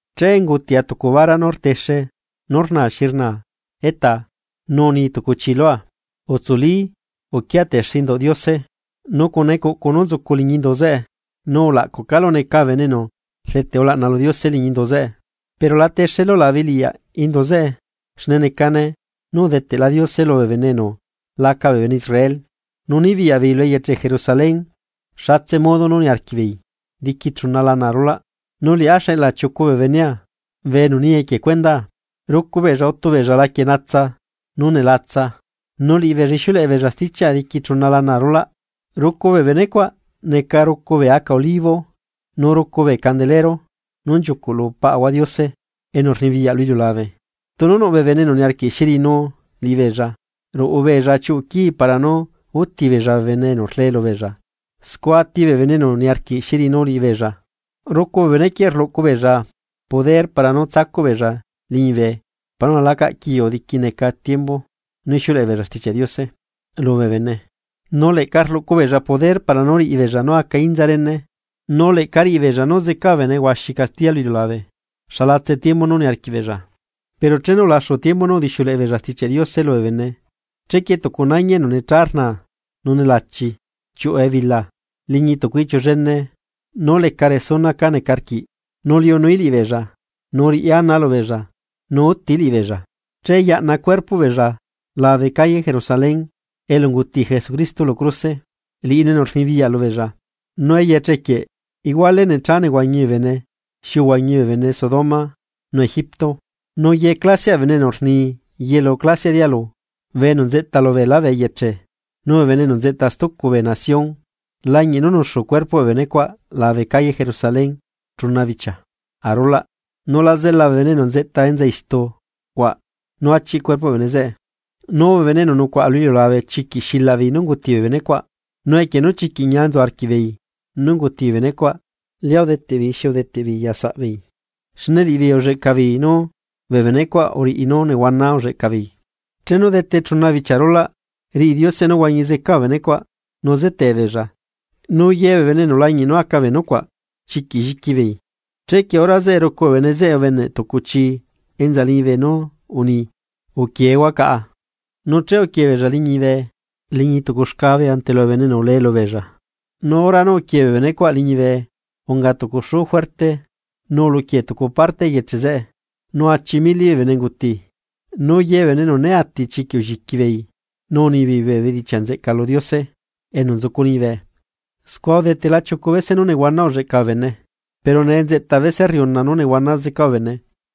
Che ungutia tucu bara nú rtexe nú rnaa xi rnaa etaa. Nu uni tucu chi lua: ―Utsuli uquia texe induꞌ Diose nu cuna ecuꞌcu nú nzucu liñi indu zeꞌe, nu ulaꞌcuꞌ calu neca bee bene enu rdeteꞌ ulaꞌna lu Diose liñi indu zeꞌe. Pero la texelu labe eleꞌyaꞌ indu zeꞌe xne necane nú udeteꞌla Diose lubee bene enu laca bee bene Israel, nu nibiyaꞌ beei lu eyeche Jerusalén xatse modo nú niarquiꞌ beei diqui chuna lana arulaꞌ. Nu liꞌá xeꞌla chiucu bee benea bee enu ni equie cuendaa. Rucu beella utu beella laquie natsa nú nelatsa. Nu liꞌibeella ixiuleꞌe beella stichiaꞌa diqui chuna lana arulaꞌ. Rucu bee bene cuaꞌ neca rucu bee aca olivo nu rucu bee candelero nú nchiucuꞌ lu Paꞌahua Diose enu rnibiyaꞌ lu iliulabe. Tunu nuꞌ bee bene enu niarquiꞌ xi riꞌinu liꞌibeella, ruꞌu beella chiuꞌu quii para nú útibeella bee bene enu rlee lubeella. Scua ati bee bene enu niarquiꞌ xi riꞌinu liꞌibeella. Rucu bee bene quieꞌ rluꞌcu poder para nú tsacuꞌ beella liñibe para nula lacaꞌ quiu diqui neca tiembu nú ixiuleꞌe beella Stichiaꞌ Diose lubee bene, nu leꞌca rluꞌcu beella poder para nú riꞌi beella nú aca inza rene, nu leꞌca riꞌi beella nú zeca bee bene huaxi castiya lu iliulabe xalatse tiembu nú niarquiꞌ beella. Pero chenu ulaxu tiembu nú udixiuleꞌe beella Stichiaꞌ Diose lubee bene, chequie tucu nañi enu necha rnaa nu nelachi chiuꞌu ebila, liñi tucu iꞌchiu llene nú leca resuna ca neca rquiꞌ, nu liunuí liꞌibeella nu riꞌí ana lubeella nu útií liꞌibeella. Che yaꞌna cuerpoꞌ beella labe calle Jerusalén elu unguti Jesucristo lu cruse, liꞌinu enu rnibiyaꞌ lubeella, nu eyeche quieꞌ iguale necha nehuañi bee bene xi uhuañi bee bene Sodoma nu Egipto. Nu ye clasiaꞌ bee bene enu rni yelu clasiaꞌ dialu, bee enu nzeꞌta lubeelá bee eyeche, nu bee bene enu nzeꞌta stucu bee nación lañiꞌ nú nuxu cuerpoꞌ bee benecuaꞌ labe calle Jerusalén chuna bichia arulaꞌ, nu la zela bee bene enu enta enza istu cuaꞌ nú achiꞌ cuerpoꞌ bee bene zeꞌe. Nu bee bene enu nucuaꞌa lu iliulabe chiquiꞌ xilaꞌbeei nú unguti bee benecuaꞌ, nu equie nú chiquiꞌ ñia nzu arquiꞌbeei nú unguti bee benecuaꞌ, lia udeteꞌ beei nú udeteꞌ beei ya saꞌbeei, xne liꞌibeei ulleꞌca beei nú bee benecuaꞌ uriꞌi nú nehuana ulleꞌca beei. Chenu dete chuna bichia arulaꞌ, riꞌi Diose nú huañi zeca bee bene cuaꞌ nu zetebeella, nu ye bee bene enu lañiꞌ nú aca bee nucuaꞌ chiquiꞌ lliqui beei. Chequie hora zeꞌe rucu bee bene zeꞌe ubeneꞌ tucu chi enza liñibe nú uni: ―Uquieehua caꞌa. Nu che uquie beella liñibe liñi tucu xcabe ante lubee bene enu ulee lubeella. Nu hora nú uquie bee benecuaꞌ liñibe unga tucu xuu juerte nu uluquie tucu parte eyeche zeꞌe, nu achi mili bee bene unguti. Nu ye bee bene enu né ati chiquiꞌ ulliqui beei nu unibeei bee bedichiaꞌ nzeꞌca lu Diose enu nzucu liñibe. Scua udetela chiucu bese nú nehuana ulleꞌca bee bene, pero nee nzeꞌta bese rriuna nú nehuana zeca bee bene.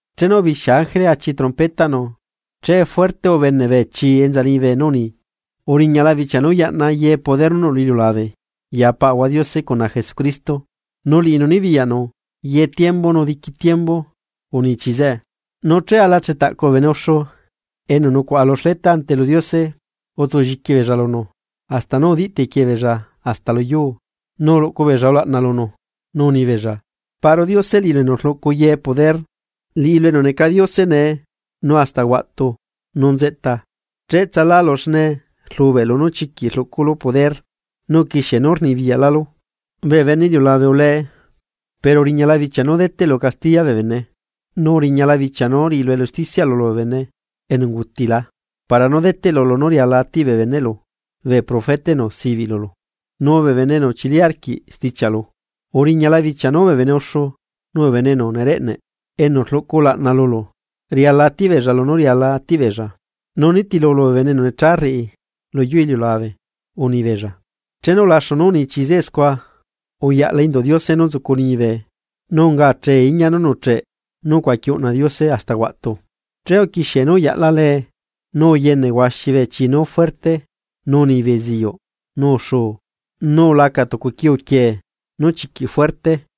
Chenu ubixia ángele achi trompetaꞌnu, che fuerte ubene bee chii enza liñibe nú uni: Uriñala bichia nú yaꞌna ye poder nú nuꞌ lu iliulabe ya Paꞌahua Diose cuna Jesucristo, nu liꞌinu nibiyaꞌnu ye tiembu nu diqui tiembu, uni chi zeꞌe. Nu che ala chetaꞌcu bee bene uxu enu nucuaꞌa lu xleta ante lu Diose, utsulliqui beella lunu, hasta nú udiꞌ tequie beella hasta lu yuu, nu uluꞌcu beella ulaꞌna lunu, nu unibeella: Paꞌru Diose, liꞌilu enu rluꞌcu ye poder, liꞌilu enu neca Diose nee, nu hasta huaꞌtu nu nzeꞌta, cheꞌtsalálu xne rlubeꞌlu nú chiquiꞌ rluꞌculu poder, nu uquixie nú rnibiyaꞌlálu. Bee bene iliulabe ulee, pero uriñala bichia nú deteꞌlu castiya bee bene, nu uriñala bichia nú hualulue lu cuendaꞌ bee bene enu ungutila para nú deteꞌlu lunú riala atiꞌ bee beneꞌlu bee profeta, enu sibiꞌ lulu nu bee bene enu uchili arquiꞌ stichiaꞌlu, uriñala bichia nú bee bene uxu nu bee bene enu nereꞌneꞌ, enu rluꞌcu ulaꞌna lulu riala nú atiꞌbeella lunú riala atiꞌ beella, nu nitilulu bee bene enu necha rriꞌi lu yuu iliulabe. Unibeella. Chenu ulaxu nú uni chii zeꞌe scua, uyaꞌla Induꞌ Diose nú nzucu liñibe, nu unga achee iñia nú nuꞌcheꞌ nú ucuaqui uꞌna Diose hasta huaꞌtu. Che uquixie nú uyaꞌla lee, nu uyene huaxi bee chi nú fuerte, nu uni beziuꞌ, nu uxuu, nu ulaca tucu quiu quiee nú chiquiꞌ fuerte.